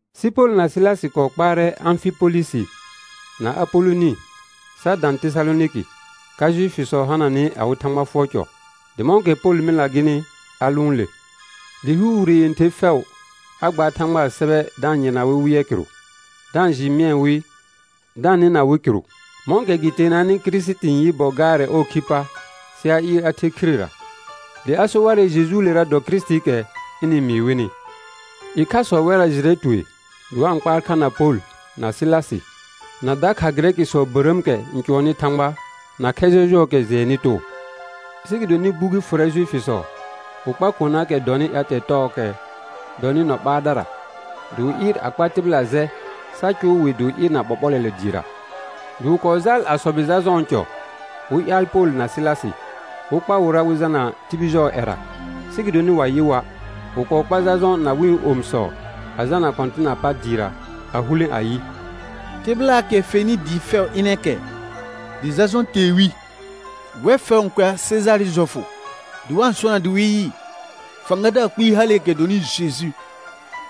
Sɩ Pol na Sɩlasɩ kɔɔ kpaarɛ Ãfɩpolɩsɩ na Apolonɩ sa dã Tesalonɩkɩ, ka Juifisɔ hananɩ awɩ Thãgba fʋɔr cɔ. Dɩ mɔ̃kɛ Pol mɩlna gɩnɩ a lʋʋn le. Dɩ hɩɩr wire yẽther fɛʋ a gbaar Thãgbaa sɛbɛ da-n yɩrna wɩ wɩ yɛ kɩrʋ, da-n jɩɩ mɩɛ wɩ da-n nɩna wɩ kɩrʋ, mɔ̃kɛ gɩ teenanɩ Kirisiti n yɩ gaarɛ ɔɔ khi pa sɩ a ɩɩr a the khirera; dɩ a so warɛ Jejuulera dɔ Kirisitiikɛ ɩnɩ-n mɩɩ wɩnɩ. Ɩkhasɔ wɛrra jɩrɛ tue dɩ wa-n kpaar kha na Pol, na Sɩlasɩ, na dakha Gɩrɛkɩsɔ bərəəmkɛ n cʋɔnnɩ Thãgba, na khɛ jɔjʋɔɔkɛ jɩɛnnɩ too. Sɩ gɩdonɩ gbugi fʋrɛ Juifisɔ, wɩ kpar konaakɛ dɔnɩ ƴatɛ tɔɔkɛ dɔnɩ nɔ ɓaardara, dɩ wɩ ɩɩr a kpa tɩbɩla jɛ sa cʋʋ dɩ wɩ ɩɩr na ɓɔɓɔlɔlɛ dɩɩra. Dɩ wɩ kɔɔ jaal a sɔbɩ Jajɔ̃ɔ cɔ, wɩ ƴaal Pol na Sɩlasɩ, wɩ kpa wɩra wɩ jalna tibil jɔɔ ƴɛra. Sɩ gɩdonɩ wa yɩ wa', wɩ kɔɔ kpar Jajɔ̃ na wɩ̃ omisɔ a jalna kɔ̃tɩnaa pa dɩɩra a hulẽ ayɩ: Tɩbɩlaakɛ n fenɩ dɩɩ fɛʋ ɩnɛ kɛ, dɩ Jajɔ̃ tee wɩ. Wɛr fɛʋ n kʋɛa Sejaarɩ jɔfʋ dɩ wa-n sona dɩ wɩ yɩ fãgadaar kpɩɩ haleekɛ dɔnɩ Jeju.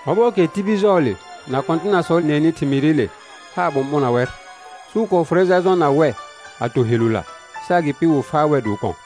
Ɔbɔɔkɛ tibil jɔɔle na kɔ̃tɩnasɔ nɩɛnɩ thɩmɩɩrɩle, haar ɓʋ̃ɓʋna wɛr. Sɩ wɩ kɔɔ fʋrɛ Jajɔ̃ na wɛ a to helula, sɩ agɩpɩ wɩ faa wɛr dɩ wɩ kɔ̃.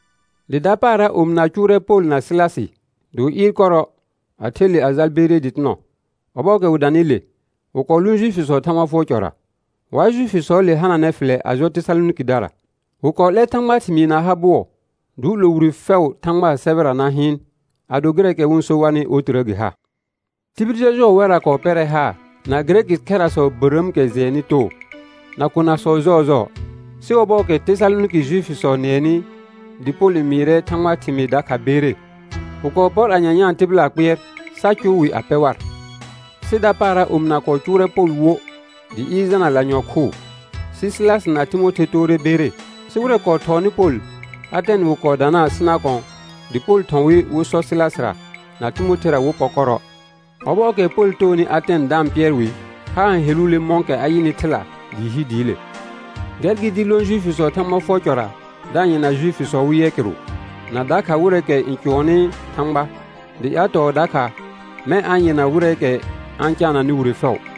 Dɩ dapaara omɩna cʋʋrɛ Pol na Sɩlasɩ dɩ wɩ ɩɩr kɔrɔ, a the le a jal Bere dɩtɩnɔ. Ɔbɔɔkɛ wɩ danɩ le, wɩ kɔɔ lʋʋn Juifisɔɔ Thãgba fʋɔr cɔra. Wa Juifisɔɔle hananɛ fɩlɛ a jɔ Tesalonɩkɩdara; wɩ kɔɔ 'lɛr Thãgbaa thɩmɩɩ na ha bʋɔ, dɩ wɩ 'lo wire fɛʋ Thãgbaa sɛbɛra na hɩɩn, ado gɩrɛɛkɛ wɩ-n so warnɩ otirə gɩ ha. Tibil jɔjʋɔɔ wɛrra kɔɔ pɛrɛ haar, na Gɩrɛkɩ khɛrasɔ bərəəmkɛ jɩɛnnɩ too, na konasɔ jɔɔjɔɔ. Sɩ ɔbɔɔkɛ Tesalonɩkɩ Juifisɔ nɩɛnɩ dɩ Pol n mɩɩrɛ Thãgbaa thɩmɩɩ dakha Bere, wɩ kɔɔ pɔr a nyanyãa tɩbɩlaa kpɩɛr sa cʋr wɩ a pɛ war. Sɩ dapaara omɩna kɔɔ cʋʋrɛ Pol wo dɩ ɩɩr jalna lanyɔ̃ khʋʋ. Sɩ Sɩlasɩ na Timothe toore Bere. Sɩ wɩrɛ kɔɔ thɔɔnɩ Pol, Atɛn wɩ kɔɔ danaa sɩ na kɔ̃, dɩ Pol thɔ̃ wɩ wɩ sɔ Sɩlasɩra na Timothera wɩ pɔ kɔrɔ. Ɔbɔɔkɛ Pol toonɩ Atɛn da-n pɩɛr wɩ, haar n heluule mɔ̃kɛ a yɩnɩ thɩla dɩɩ hi dɩɩle. Gɛr gɩ dɩ lõ Juifisɔɔ Thãgba fʋɔr cʋɔra da-n yɩrna Juifisɔ wɩ yɛ kɩrʋ, na dakha wɩrɛɛkɛ n cʋɔnnɩ Thãgba, dɩ ƴatɔɔ dakha mɛ̃ a-n yɩrna wɩrɛɛkɛ a-n caananɩ wire fɛʋ.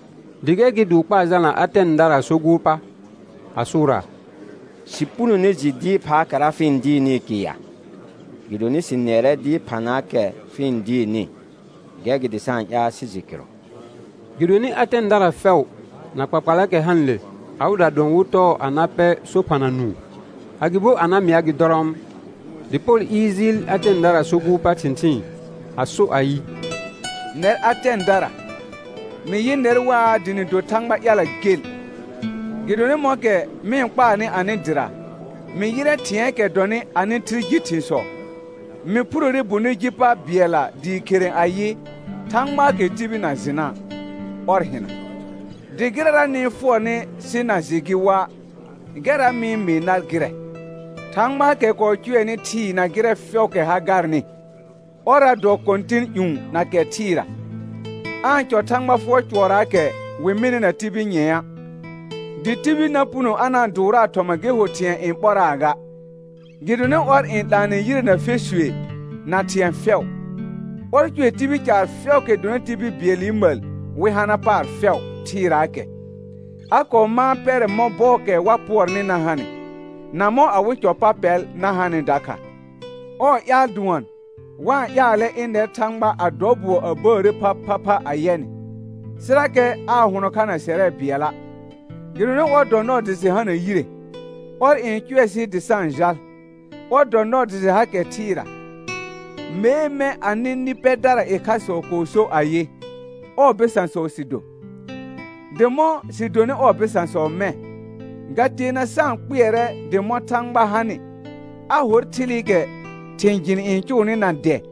Dɩ gɛr gɩ dɩ wɩ kpaa jalna Atɛndaraa so gʋʋr pa, a sʋʋraa: Sɩ punone jɩ dɩɩr phaakɛra fɩ-n dɩɩrnɩɩ kɩr ya? Gɩdonɩ sɩ nɩɛrɛ dɩɩr phanaakɛ fɩ-n dɩɩrnɩ, gɛr gɩ dɩ sa-n ƴaal sɩ jɩ kɩrʋ. Gɩdonɩ Atɛndara fɛʋ na kpakpalaakɛ hanɩle, awɩda dʋɔn wɩ tɔɔ a na pɛ so phana nũu, agɩbo a na mɩa gɩ dɔrɔɔm. Dɩ Pol ɩɩr jɩɩl Atɛndaraa so gʋʋr pa thɩ̃thɩɩn, a so ayɩ: Nɛr Atɛndara, mɩ yɩ nɛr waa dɩ nɩ do thãgba ƴala gel. Gɩdonɩ mɔ̃kɛ mɩ-n kpaarnɩ anɩ dɩra, mɩ yɩrɛ thɩ̃ɛɛkɛ dɔnɩ anɩ thɩl ji thɩ̃sɔ; mɩ phurore bonɩ ji pa bɩɛlla dɩɩ khere ayɩ: Thãgbaakɛ tibil na jɩna', ɔr hɩna. Dɩ gɩrɛra nɩ-n fʋɔrnɩ sɩ na jɩ gɩ wa', gɛrra mɩ-n mɩɩ nar gɩrɛ. Thãgbaakɛ kɔɔ cʋɛnɩ thɩɩ na gɩrɛ fɛʋʋkɛ ha garnɩ, ɔrra dɔ Kɔ̃tɩn ƴũ na kɛ thɩɩra, aa-n cɔ Thãgba fʋɔr cʋɔrraakɛ wɩ mɩnɩ na tibil nyɛ̃a'; dɩ tibil na puno a na-n dʋʋraa thɔma gɩ ho thɩ̃ɛ n ɓɔraa ga, gɩdonɩ ɔr n 'laanɛ yire na fesue na thɩ̃ɛ fɛʋ. Ɔr cʋɛ tibil caar fɛʋʋkɛ dɔnɩ tibil bɩɛlɩ məl wɩ hana paar fɛʋ thɩɩraakɛ, a kɔɔ mãa pɛrɛ mɔ̃ bɔɔkɛ wa pʋɔrnɩ na hanɩ, na mɔ̃ awɩ cɔ pa pɛl na hanɩ dakha. Ɔɔ ƴaal dʋɔn, wa-n ƴaalɛ ɩnɛr Thãgba a dɔ bʋɔ a bəəre phaphapha a yɛ nɩ, sɩrakɛ aa hʋnɔ kha na sɛrɛ bɩɛla'. Gɩdonɩ ɔr dɔ nɔɔ dɩ sɩ hana yire, ɔr n cʋɛ sɩ dɩ sa-n jal, ɔr dɔ nɔɔ dɩ sɩ hakɛ thɩɩra. Mee, mɛ̃ anɩ nɩ pɛdara ɩkhasɔ kɔɔ so ayɩ: «Ɔɔ bɩsãsɔ sɩ do.» Dɩ mɔ̃ sɩ donɩ ɔɔ bɩsãsɔ mɛ̃, ga teena sa-n kpɩɛrɛ dɩ mɔ̃ Thãgba hanɩ, a hor thɩlɩkɛ thɩ̃ jɩn n cʋʋnɩ na dɛ,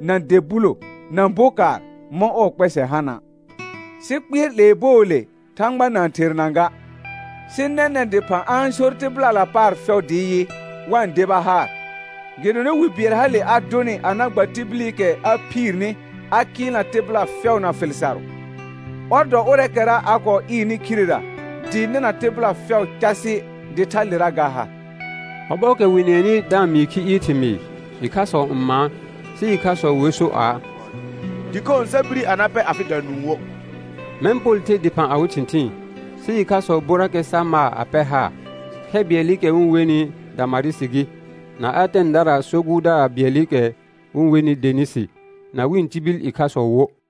na dɛ bulo, na bokaar mɔ̃ ɔɔ kpɛsɛ hana'. Sɩ kpɩɛr 'lee bɔɔle Thãgba na-n therna ga, sɩ nɛnɛ̃ dɩphã a-n sor tɩbɩlala paar fɛʋ dɩ yɩ, wa-n deba haar; gɩdonɩ wi bɩɛl hale a dʋnɩ a na gba tibilikɛ a phiirni a kɩɩlna tɩbɩla fɛʋ na fɩl sarʋ, ɔr dɔ ʋrɛɛkɛra a kɔɔ ɩɩrnɩ khirera dɩɩ nɩna tɩbɩla fɛʋ casɩ dɩ thalera ga ha. Ɔbɔɔkɛ wɩ nɩɛnɩ da-n mɩɩ khi ɩɩr thɩmɩɩr, ɩkhasɔ n maan, sɩ ɩkhasɔ wer so aa: Dɩkhõo sa bire a na pɛ afɩda nũu wo. Mɛ̃ Pol the dɩphã awɩ thɩ̃thɩɩn. Sɩ ɩkhasɔ borrakɛ sa maa a pɛr haar, khɛ bɩɛlɩkɛ wɩ-n wenɩ Damarɩsɩ gɩ, na Atɛndaraa so gʋʋrdaar bɩɛlɩkɛ wɩ-n wenɩ Denisi, na wɩ̃ tibil ɩkhasɔ wo.